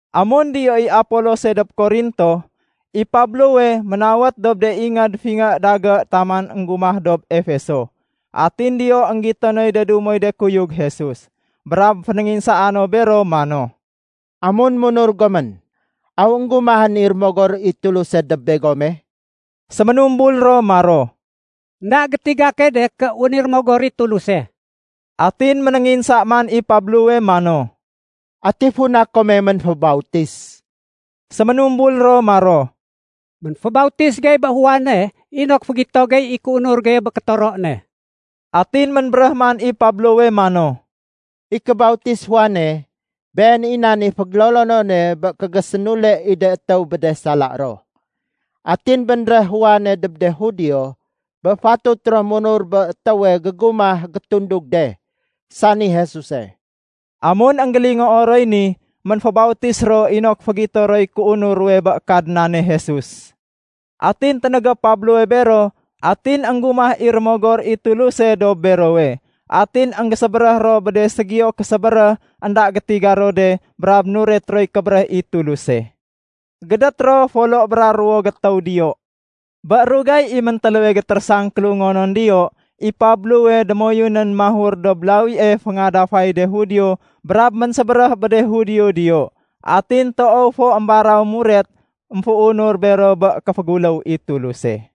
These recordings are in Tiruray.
Amun diyo i Apolose dob Korinto, i Pablowe ménawét dob de ingéd fingé dagé taman énggumah dob Efeso. Atin diyo énggito noy de dumoy de kuyug Jesus. Brab fénénginsaa no bero mano, “Amun munur gomén, aw énggumahén i Rémogor i Tuluse dob begome?” Séménumbul ro maro, “Enda gétiga key de ké wén i Rémogor i Tuluse.” Atin ménénginsa man i Pablowe mano, “Ati funa kome ménfébautis?” Séménumbul ro maro, “Ménfébautis gey bé Juane inok fégito gey i kéunur geye bé kétoro ne.” Atin ménbéréh man Pablowe mano, “I kébautis Juane, been i nan i fégélolonone bé kégésénule i de étéw bé de sala ro. Atin bénréh Juane dob de Judio bé fatut ro munur bé étéwe gégumah gétundug de, sani Jesuse.” Amun énggélingoo roy ni, ménfébautis ro inok fégito roy kéunur ruwe bé Kadnane Jesus. Atin ténégé Pablowe bero atin énggumah i Rémogor i Tuluse dob berowe. Atin énggésébéréh ro bé de ségiyo késébéréh énda gétiga ro de brab nuret roy kébéréh i Tuluse. Gédét ro folo bra ruwo gétéw diyo. Bé rugay i méntéléwe gétérésang kélungonon diyo, i Pablowe démoyunén mahur dob lawie féngadafay de Judio brab ménsébéréh bé de Judio diyo. Atin toow fo émbaraw muret émféunur bero bé kéféguléw i Tuluse.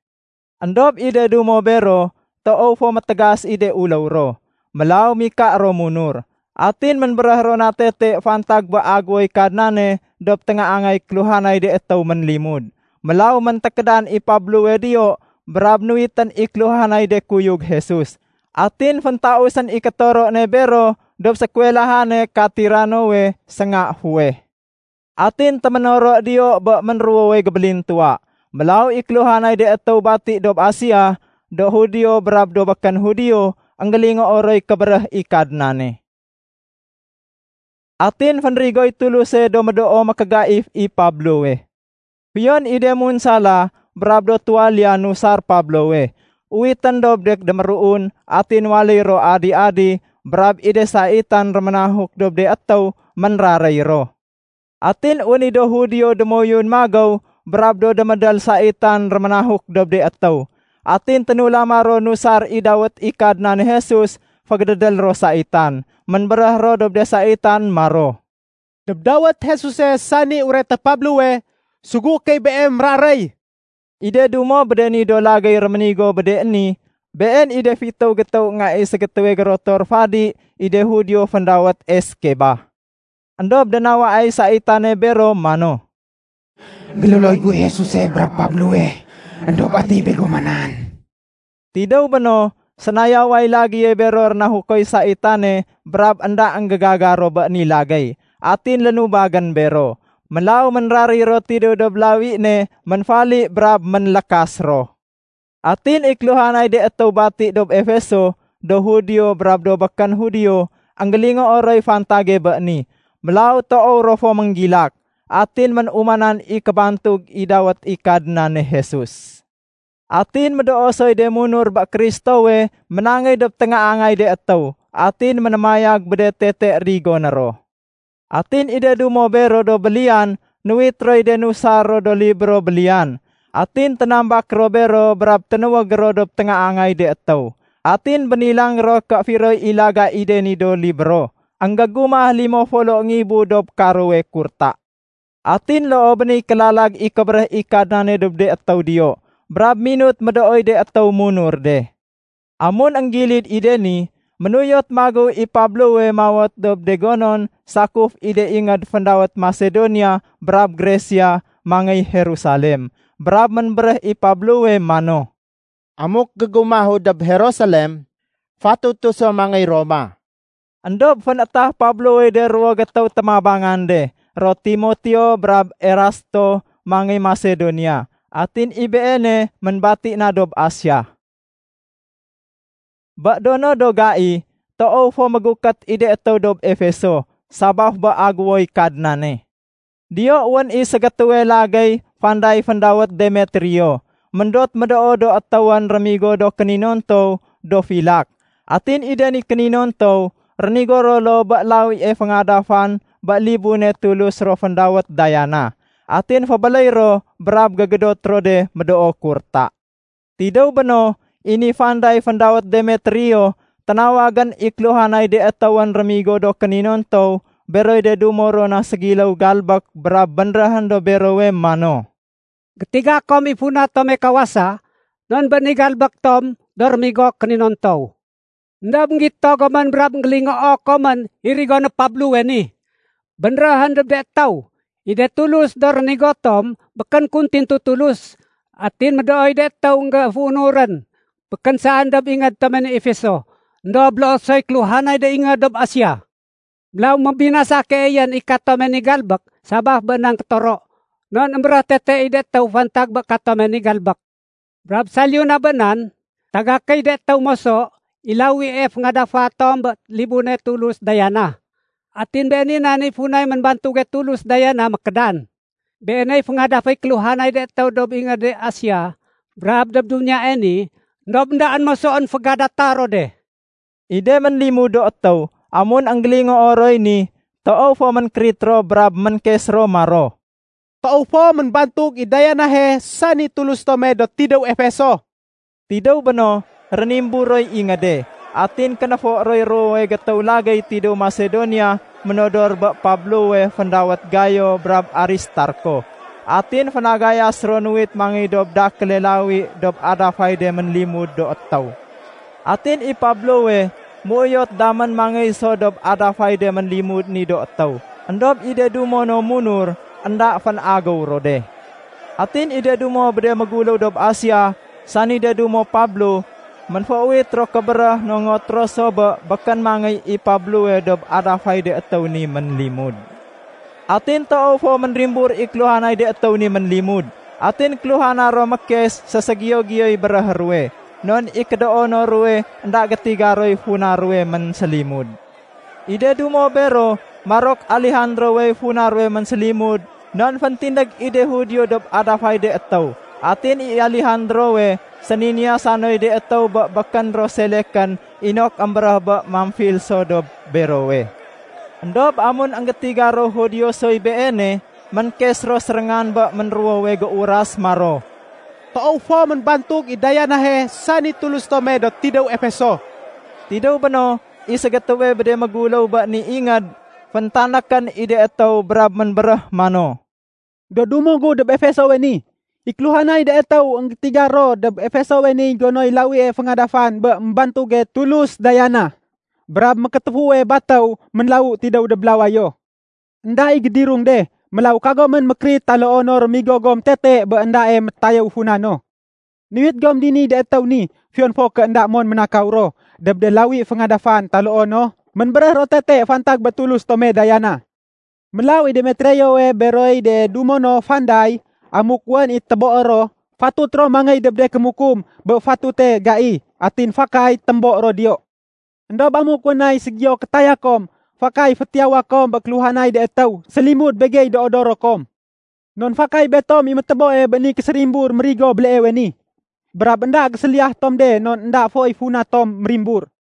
Endob i de dumo bero toow fo métégas i de uléw ro, mélaw mika ro munur. Atin ménbéréh ro na tete fantag bé Agéwoy Kadnane dob téngaangay kéluhanay de étéw ménlimud. Mélaw méntékédan i Pablowe diyo brab nuwitén i kéluhanay de kuyug Jesus. Atin féntausén i kétoro ne bero dob sékuwelahane ka Tiranowe sénga fuweh. Atin téménoro diyo bé ménruwowe gébélintuwa. Mélaw i kéluhanay de étéw bati dob Asia, do Judio brab do békén Judio, énggélingoo roy kébéréh i Kadnane. Atin fénrigoy Tuluse do médoo mékégaif i Pablowe. Fiyon i de munsala brab do tuwaliya nusar Pablowe, uwitén dob de déméruun atin waléy ro adi-adi brab i de saitan réménahuk dob de étéw, ménraréy ro. Atin wén i do Judio démoyun magéw brab do démédél saitan réménahuk dob de étéw. Atin ténulama ro nusar i dawét i Kadnane Jesus fégédédél ro saitan. Ménbéréh ro dob de saitan maro, “Dob dawét Jesuse sani ureté Pablowe, sugué key beem méraréy.” I de dumo bé de ni do lagéy réménigo bé de ni, been i de fitéw gétéw nga i ségétéwe gérotor fadi i de Judio féndawét Eskeba. Endob dénawaay saitane bero mano, “Gélolo guy Jesuse brab Pablowe, éndob ati begoma nan?” Tidéw béno, sénayaway lagéye bero rénahukoy saitane brab énda énggégaga ro bé ni lagéy. Atin lénubagén bero. Mélaw ménraréy ro tidéw dob lawi ne ménfali brab ménlékas ro. Atin i kéluhanay de étéw bati dob Efeso, do Judio brab do békén Judio énggélingoo roy fantage bé ni. Mélaw toow ro fo ménggilak. Atin ménumanan i kébantug i dawét i Kadnane Jesus. Atin médoo soy de munur bé Kristowe ménangéy dob téngaangay de étéw atin ménémayag bé de tete rigoné ro. Atin i de dumo bero do béliyan nuwit roy de nusar ro do libro béliyan. Atin ténambak ro bero brab ténuwég ro dob téngaangay de étéw. Atin bénilang ro ké firoy i laga i de ni do libro, énggégumah limo folo ngibu dob karowe kurta. Atin loo bé niy kélalag i kébéréh i Kadnane dob de étéw diyo, brab minut médooy de étéw munur de. Amun énggilid i de ni, ménuyot magéw i Pablowe mawét dob de gonon sakuf i de ingéd féndawét Masedonia brab Gresia mangéy Jerusalem. Brab ménbéréh i Pablowe mano, “Amuk gégumahu dob Jerusalem, fatutu so mangéy Roma.” Endob fénétah Pablowey de ruwo gétéw témabangan de ro Timoteo brab Erasto mangéy Masedonia. Atin i beene ménbati na dob Asia. Bé do no do gai, toow fo mégukét i de étéw dob Efeso sabaf bé Agéwoy Kadnane. Diyo wén i ségétéwe lagéy fanday féndawét Demetrio, méndot médoo do étéwén rémigo do kéninontow do filak. Atin i de ni kéninontow rénigo ro loo bé lawie féngadafan bé libune tulus ro féndawét Diana, atin fébéléy ro brab gégédot ro de médoo kurta. Tidéw béno, i ni fanday féndawét Demetrio ténawagén i kéluhanay de étéwén rémigo do kéninontow beroy de dumo ro na géségiléw galbék brab bénréhén dob berowe mano, “Gétiga kom i funa tome kawasa non bé ni galbék tom do rémigo kéninontow. Endob énggito gomén brab énggélingoo komén i rigoné Pablowe ni. Bénréhén dob de étéw, i de tulus do rénigo tom békén kun tintu tulus. Atin médooy de étéw énggéféunurén. Békén saén dob ingéd tome ni Efeso, éndob loo soy kéluhanay de ingéd dob Asia. Mélaw mébinasa keeyén i katome ni galbék sabaf bé nan kétoro, non émbéréh tete i de étéw fantag bé katome ni galbék. Brab saliyu na bé nan, tagakéy de étéw moso i lawie féngadafa tom bé libune tulus Diana. Atin been i nan i funay ménbantuge tulus Diana mékédan. Beeney féngadaféy kéluhanay de étéw dob ingéde Asia brab dob duniyae ni, éndob éndaén mosoén fégadata ro de.” I de ménlimud do étéw, amun énggélingoo roy ni, toow fo ménkérit ro brab ménkes ro maro, “Toow fo ménbantug i Dianahe sani tulus tome do tidéw Efeso.” Tidéw béno, rénimbur roy ingéde. Atin kenéfo roy ruwowe gétéw lagéy tidéw Masedonia ménodor bé Pablowe féndawét Gayo brab Aristarko. Atin fénagayas ro nuwit mangéy dob dakéle lawi dob adafay de ménlimud do étéw. Atin i Pablowe méuyot damén mangéy so dob adafay de ménlimud ni do étéw. Endob i de dumo no munur énda fénagéw ro de. Atin i de dumo bé de méguléw dob Asia sani de dumo Pablo, ménféuwit ro kébéréh nongot ro so bé békén mangéy i Pablowe dob adafay de étéw ni ménlimud. Atin toow fo ménrimbur i kéluhanay de étéw ni ménlimud atin kéluhana ro mékes séségiyo-giyoy béréhé ruwe, non i kédoono ruwe énda gétiga roy funa ruwe ménsélimud. I de dumo bero marok Alejandrowey funa ruwe ménsélimud non féntindég i de Judio dob adafay de étéw. Atin i Alejandrowe séniniyasa noy de étéw bé békén ro selekén inok émbéréh bé mamfil so dob berowe. Endob amun énggétiga ro Judio soy beene, ménkes ro séréngan bé ménruwowe géuras maro, “Toow fo ménbantug i Dianahe, sani tulus tome do tidéw Efeso.” Tidéw béno, i ségétéwe bé de méguléw bé ni ingéd, féntanékén i de étéw brab ménbéréh mano, “Do dumo gu dob Efesowe ni, i kéluhanay de étéw énggétiga ro dob Efesowe niy gonoy lawie féngadafan bé ménbantuge tulus Diana brab mékétéfuwe batéw ménlawu tidéw dob lawayo. Enda i gédirung de. Mélaw kagomén mékérit taloo no rémigo gom tete bé éndae métayéw funa no. Nuwit gom diniy de étéw ni fiyon fo ké énda mon ménénakaw ro dob de lawi féngadafan taloo no ménbéréh ro tete fantag bé tulus tome Diana. Mélaw i Demetriowe beroy de dumo no fanday, amuk wén i téboé ro, fatut ro mangéy dob de kémukum bé fatute gai. Atin fakay témbo ro diyo. Endob amuk wén nay ségiyo kétaya kom, fakay fétiyawa kom bé kéluhanay de étéw sélimud begey do odoro kom. Non fakay betom i météboe bé ni késérimbur ménrigo béleewe ni. Brab énda géséliyah tom de non énda foy funa tom mérimbur.”